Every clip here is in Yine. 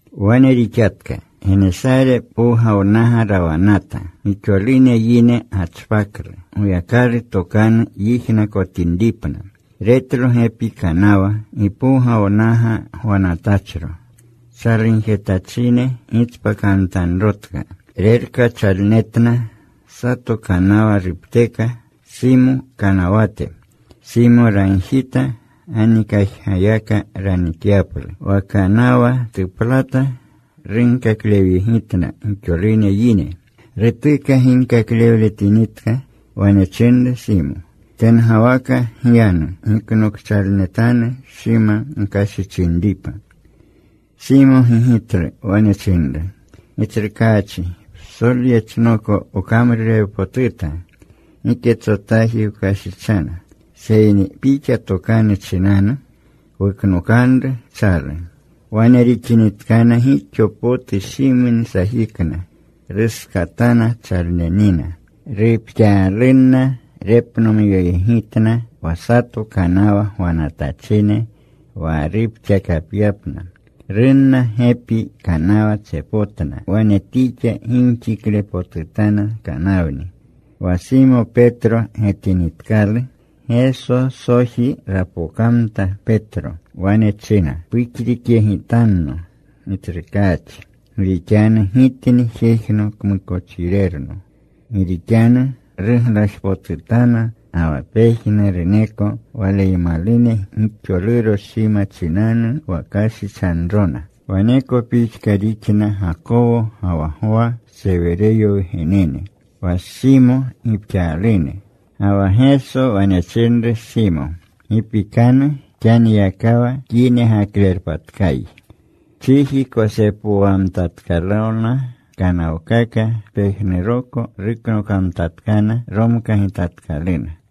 Wane rixatka. Genesare Powgawnaga rawanata. Gixolune yine gachpaklu, Goyakalu tokanu yijnakotinripna. Retlo gepi kanawa, gipowgawnaga gwanatachro. Chalugjetachine gitspakamtanrotka. Rerkachalnetna. Sato kanawa rupteka, Simo kanawate. Simo ragjita ganikajgayaka ranikyaplu. Kanawa tuplata. Runkaklewyegitna gixolune yine. Rutuka ginkaklewletinitka, wane chinru Simo, “Tengawaka gyanu. Giknokchalnetanu shima gkashichinripa.” Simo gigitlu. Wane chinru, “Gitsrukaachi, psolyechnoko wkamrurewpotuta. Giketsotaaji wkashichana. Seyni Pixa tokanu chinanu, wuknokanru chalu.” Wane rixinitkana gixo potu shimni sajikna. Ruskatana chalnenina. Rupxaalunna repnomyoyegitna wa sato kanawa gwanatachine wa rupxakapyapna. Runna. Gepi kanawa tsepotna. Wane tixa gimxiklepotutana kanawni. Wa Simo Petro getinitkalu, Gesosoji rapokamta Petro. Wane china, “Puxrikyegitanno, Gitsrukaachi. Gi rixanu gitni jejno kmukochirerno.” Gi rixanu ruglajpotutana ga wa pejnuruneko waleymalune gixoluro shima chinanu wa kashichanrona. Waneko pixka rixna Gakowo ga wa Gwa, Sewereyo wgenene, wa Simo gipxaalune. Ga wa Geso wane chinru Simo, “Gi pikanu. Xaniyakawa kyinegaklerpatkayi.” Chiji kosepowamtatkalona kanawkaka. Pejnuruko ruknokamtatkana. Romkagitatkaluna.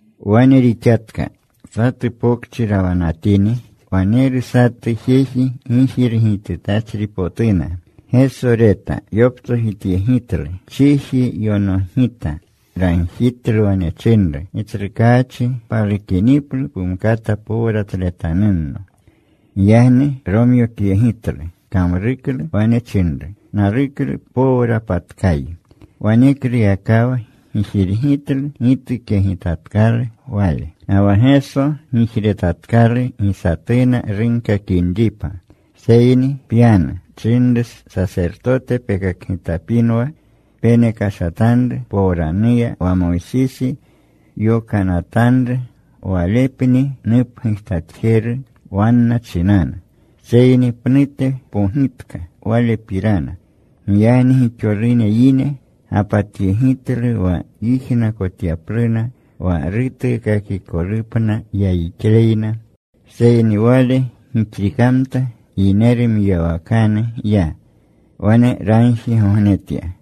Wane rixatka. Satu pokchi rawanatini, waneru satu jeji gijirgitutachripotuna. Geso reta. Yoptsojityegitlu. Chiji yonogita. Ragjitlu. Wane chinru, “Gitsrukaachi, palukiniplu pumkata powratletanunno.” Giyagni romyokyegitlu. Kamruklu. Wane chinru, “Naluklu. Powrapatkayi.” Wanekluyakawa gijirgitlu gitukyegitatkalu wale. Ga wa Geso gijretatkalu gi satuna runkakinripa, seyni, “Pyanu,” chinru. “Sasertote pekakgitapinwa. Penekashatanru powranuya wa Moysisi yokanatanru. Walepni nupgujtatjeru wanna chinanu.” Seyni pnute pogitka Walepirana. Giyagni gixolune yine gapatyegitlu wa yijnakotyapluna, wa rutuukakikolupna yayixleyna. Seyni Wale gixrikamta. Yineru mwiyawakanu ya. Wane ragjigognetya.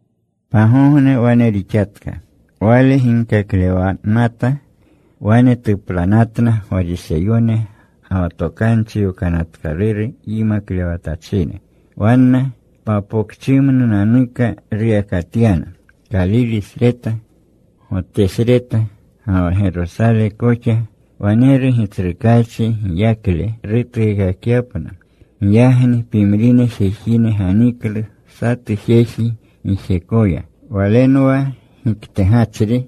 Pagogne wane rixatka. Wale ginkaklewanata. Wane tuplanatna Gwariseyone ga wa Tokanchi Yokanatkaluru yimaklewatachine. Wanna papokchimnunanuka ruyakatyana, Kalilesreta, Gotesreta, ga wa Gerosale koxa. Waneru Gitsrukaachi giyakle rutuukakyapna. Giyagni pimrine jejine ganiklu satu jeji gijekoya. Walenwa giktegachri.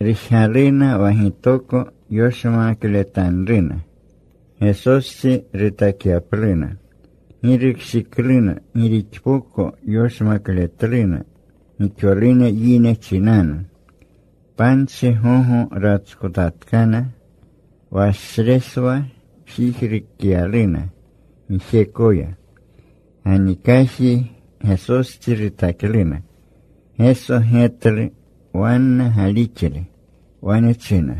Rujgaluna wa gitoko yoshmakletanruna, Gesostsi rutakyapluna. Gi rukshikluna gi rixpoko yoshmakletluna gixolune yine chinanu. Panchi gogo ratskotatkana. Washreswa jijrukyaluna gijekoya. Ganikaji Gesostsi rutakluna. Geso getlu wanna galixle. Wane china,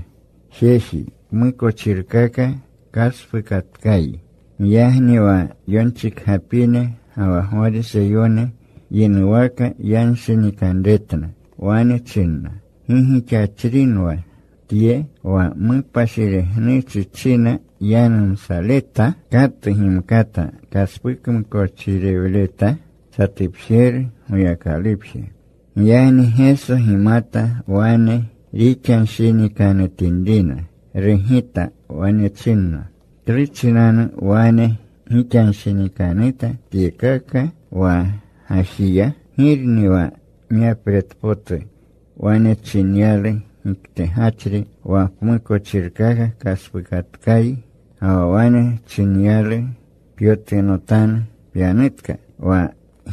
“Jeji, pmukochirkaka kaspuukatkayi.” Giyagni wa yonchikgapine ga wa Gwariseyone yinuwaka yanshinikanretna. Wane chinna, “¿Gi gixachrinwa Tye wa mupashiregnuchi china yanumsaleta? ¿Katu gimkata kaspukmukochiirewleta? Satupjeru, Goyakalupje.” Giyagni Geso gimata wane rixanshinikanutinrina. Rugita. Wane chinna, “¿Klu chinanu wane gixanshinikanuta tyekaka wa gajiya? ¿Girni wa myapretpotu, wane chinyalu giktegachri, ‘Wa pmukochirkaka kaspuukatkayi,’ ga wa wane chinyalu, ‘Pyotunotanu. Pyanutka?’ Wa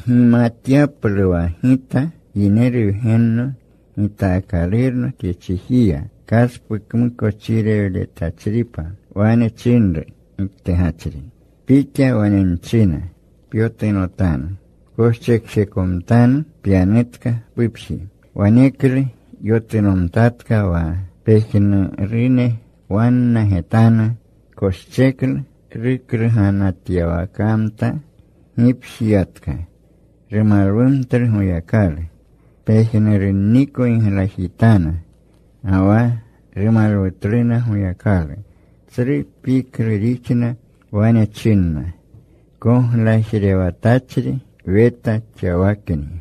gimatyaplu wa Gita Yineru Wgenno gitaakalurno tye chijiya kaspukmukochirewletachripa,” wane chinru giktegachri, “Pixa wane nchina, Pyotunotanu. Pkoschekjekomtanu. Pyanutka pupji.” Waneklu yotunomtatka wa pejnurune wanna getanu. Koscheklu rukluganatyawakamta. Gipji yatka. Rumalwumtlu Goyakalu. Pejnurunniko giglajitana, ga wa rumalwutluna Goyakalu. Tsru piklu rixna. Wane chinna, “Koglajlewatachri weta xawakni.”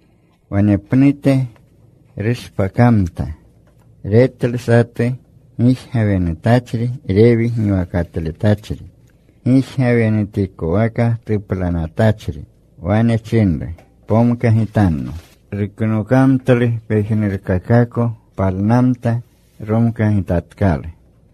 Wanepnute rushpakamta. Retlu satu gijgawenutachri. Rewi giwakatletachri, gijgawenutikwaka tuplanatachri. Wane chinru, “Pomkagitanno.” Ruknokamtlu pejnurkakako. Palnamta. Romkagitatkalu.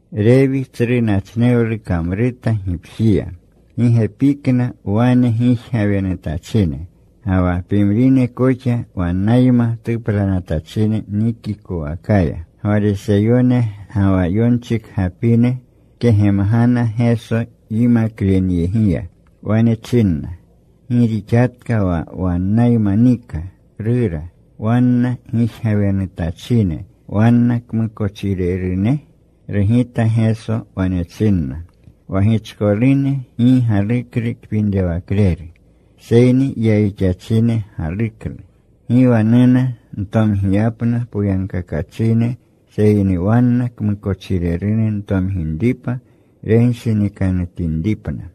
Rewi tsru nachnewlu kamruta gipjiya. Gi gepikna wane gijgawenutachine ga wa pimrine koxa wannayma tuplanatachine nikikowakaya. Gwariseyone ga wa yonchikgaprenna kegemgana Geso yimaklenyegiya. Wane chinna, “¿Gi rixatka wa wannayma nika, rura, wanna gijgawenutachine, wanna kmukochirerune?” Rugita Geso. Wane chinna, “Wa gichkolune gi galuklu kpinrewakleru, seyni yayixachine galuklu. Gi wa nuna ntomgiyapna poyagkakachine seyni wanna kmukochirerune ntomginripni renshinikanutinripna.”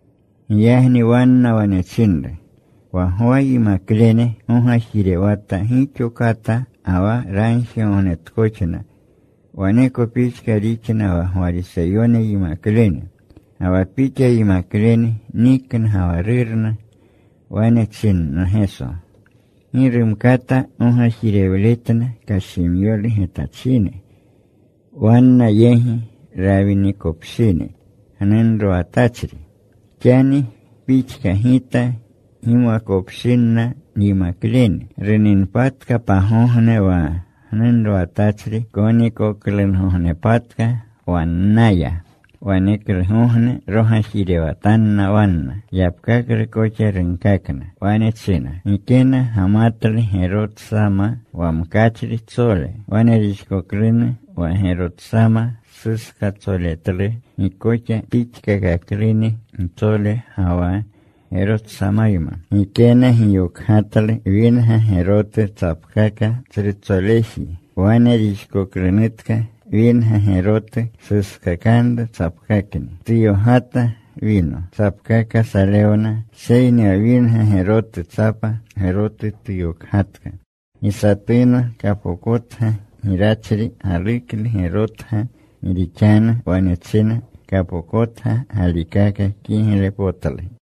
Giyagni wanna wane chinru, “Wa Gwa yimaklene gogajirewata gixo kata ga wa ragjigognetkoxna. Waneko pixka rixna wa Gwariseyone yimaklene. Ga wa Pixa yimaklene nikna ga wa rurna.” Wane chinna Geso, “Gi rumkata gogajirewletna kashimyolu getachine, wanna yegi rawinikopshini gnunrowatachri, xani pixka Gita gimwakopshinna nyimaklene. Runinpatka pagogne wa gnunrowatachri konikolgognepatka wannaya. Waneklugogne rogajirewatanna wanna.” Yapkaklu koxa runkakna. Wane china, “Gikena gamatlu gerotsama wa mkachritsole. Wane rixkoklunu wa gerotsama suskaktsoletlu. Gi koxa pixkakakluni gitsole ga wa gerotsamayma. Gikena giyokgatlu winga gerotu tsapkaka tsrutsoleji. Wane rixkoklunutka winga gerotu suskakanru tsapkakni. Tuyokgata wino. Tsapkaka salewna. Seyni wa winga gerotu tsapa gerotu tuyokgatka. Gi satuna kapokotga girachri galuklu gerotga. Gi rixanu wane china, ‘Kapokotga galikaka kiglepotlu.’”